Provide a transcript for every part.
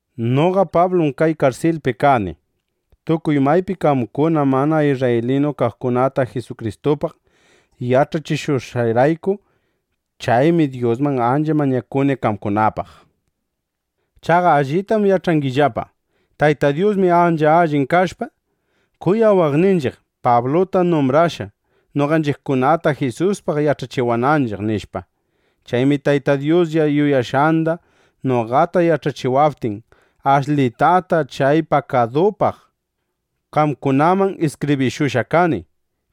Noqa Pablum kay karsilpi kani, tukuy maypi qamkuna mana isrraylinu kaqkunata Jisukristupaq yach'achishushqayrayku. Chaymi Dyusman ancha mañakuni qamkunapaq. Chaqa allitam yach'angillapa: Tayta Dyusmi ancha allin kashpa, kuyawaqninchiq, Pabluta numbrashqa, noqanchiqkunata Jisuspaq yach'achiwananchiq, nishpa. Chaymi Tayta Dyuslla yuyashqanda noqata yach'achiwaptin, ashlitata chay pakadupaq qamkunaman iskibrishushqa kani.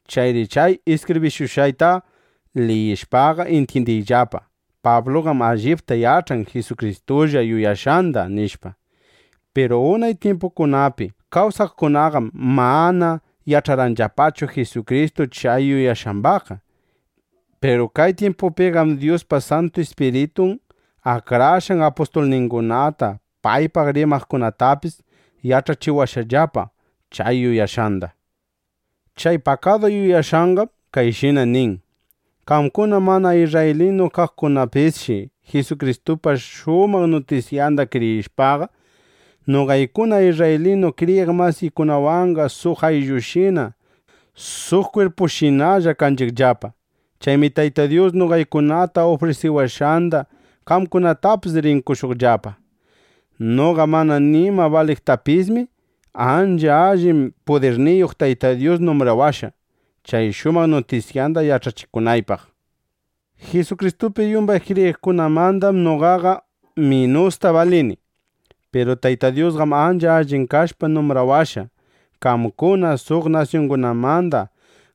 Chayri chay iskibrishushqayta liyishpaqa, intyindiyllapa: Pabluqam allipta yach'an Jisukristulla yuyashqanda, nishpa. Piru unay tyimpukunapi kawsaqkunaqam mana yach'arqanllapachu Jisukristu chay yuyashqambaqqa. Piru kay tyimpupiqam Dyuspa Santu Ispiritun akrashqan apustulningunata, paypaq rimaqkunatapis yach'achiwashqallapa chay yuyashqanda. Chay pakadu yuyashqanqam kayshina nin: Qamkuna mana isrraylinu kaqkunapisshi Jisukristupa shumaq nutisyanda kriyishpaqa, noqaykuna isrraylinu kriyiq masikikunawanqa suq ayllushina suq kwirpushinalla kanchiqllapa. Chaymi Tayta Dyus noqaykunata ufrisiwashqanda qamkunatapis rin qoshuqllapa. Noqa mana nima baliptiypismi, ancha allin pudirniyuq Tayta Dyus numbrawashqa, chay shumaq nutisyanda yach'achikunaypaq. Jisukristupi yumbay kriyiqkunamandam noqaqa minusta balini. Piru Tayta Dyusqam ancha allin kashpa numbrawashqa, qamkuna suq nasyungunamanda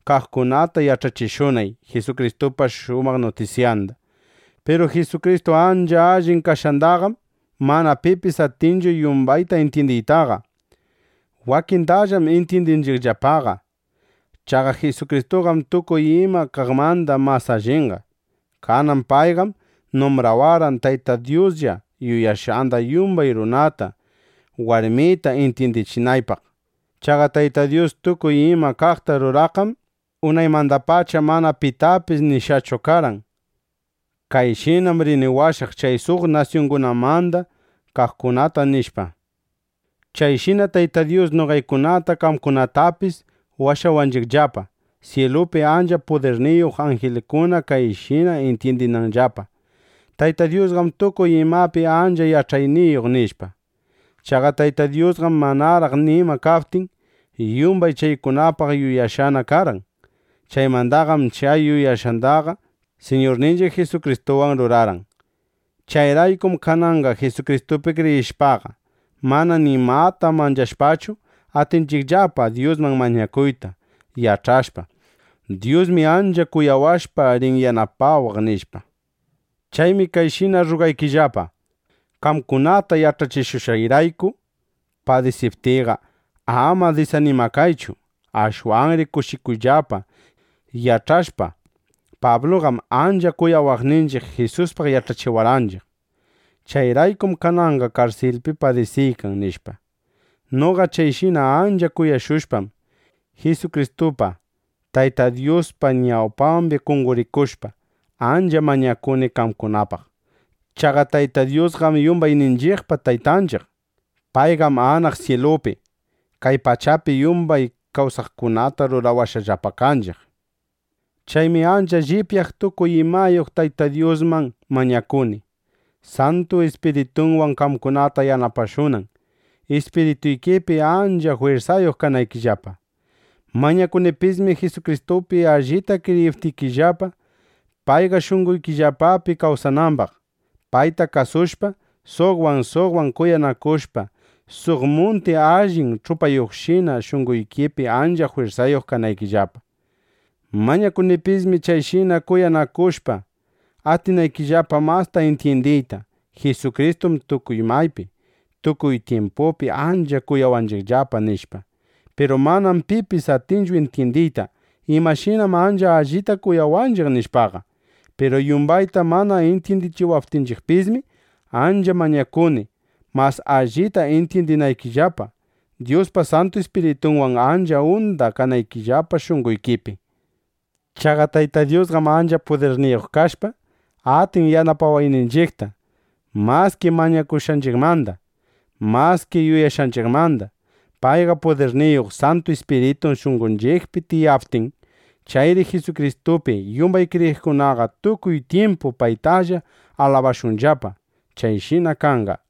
kaqkunata yach'achishunay Jisukristupa shumaq nutisyanda. Piru Jisukristu ancha allin kashqandaqam mana pipis atinchu yumbayta intyindiytaqa. Wakindallam intyindinchiqllapaqa. Chaqa Jisukristuqam tukuy ima kaqmanda mas allinqa. Kanan payqam numbrawarqan, Tayta Dyuslla yuyashqanda yumbay runata, warmita intyindichinaypaq. Chaqa Tayta Dyus tukuy ima kaqta ruraqqam unaymandapacha mana pitapis nishqachu karqan: “Kayshinam rini washaq chay suq nasyungunamanda kaqkunata”, nishpa. Chayshina Tayta Dyus noqaykunata, qamkunatapis washawanchiqllapa, syilupi ancha pudirniyuq anjilkuna kayshina intyindinanllapa: Tayta Dyusqam tukuy imapi ancha yach'ayniyuq, nishpa. Chaqa Tayta Dyusqam, manaraq nima kaptin, yumbay chaykunapaq yuyashqana karqan. Chaymandaqam chay yuyashqandaqa Siñurninchiq Jisukristuwan rurarqan. Chayraykum kananqa Jisukristupi kriyishpaqa, mana nimata manchashpachu, atinchiqllapa Dyusman mañakuyta, yach'ashpa: Dyusmi ancha kuyawashpa, rin yanapawaq, nishpa. Chaymi kayshina rrugaykillapa: Qamkunata yach'achishushqayrayku padisiptiyqa, ama disanimakaychu. Ashwanri kushikuyllapa, yach'ashpa: Pabluqam ancha kuyawaqninchiq Jisuspaq yach'achiwarqanchiq. Chayraykum kananqa karsilpi padisiykan, nishpa. Noqa chayshina ancha kuyashushpam, Jisukristupa Tayta Dyuspa ñawpambi qonqorikushpa, ancha mañakuni qamkunapaq. Chaqa Tayta Dyusqam yumbayninchiqpa Taytanchiq. Payqam anaq syilupi, kay pachapi yumbay kawsaqkunata rurawashqallapa kanchiq. Chaymi ancha llipyaq tukuy imayuq Tayta Dyusman mañakuni, Santu Ispiritunwan qamkunata yanapashunan, ispirituykipi ancha jwirsayuq kanaykillapa. Mañakunipismi Jisukristupi allipta kriyiptikillapa, payqa shunqoykillapapi kawsanambaq, payta kuyashpa, suqwan suqwan kuyanakushpa, suq munti allin ch'upayuqshina shunqoykipi ancha jwirsayuq kanaykillapa. Mañakunipismi chayshina kuyanakushpa, atinaykillapa masta intyindiyta: Jisukristum tukuy maypi, tukuy tyimpupi ancha kuyawanchiqllapa, nishpa. Piru manam pipis atinchu intyindiyta imashinam ancha allita kuyawanchiq, nishpaqa. Piru yumbayta mana intyindiptinchiqpismi, ancha mañakuni, mas allita intyindinaykillapa, Dyuspa Santu Ispiritunwan ancha unda kanaykillapa shunqoykipi. Chaqa Tayta Dyusqam ancha pudirniyuq kashpa, atin yanapawayninchiqta maski mañakushqanchiqmanda, maski yuyashqanchiqmanda, paypa pudirniyuq Santu Ispiritun shunqonchiqpi tiyaptin. Chayri Jisukristupi yumbay kriyiqkunaqa tukuy tyimpu paytalla alabashunllapa. ¡Chayshina kanqa!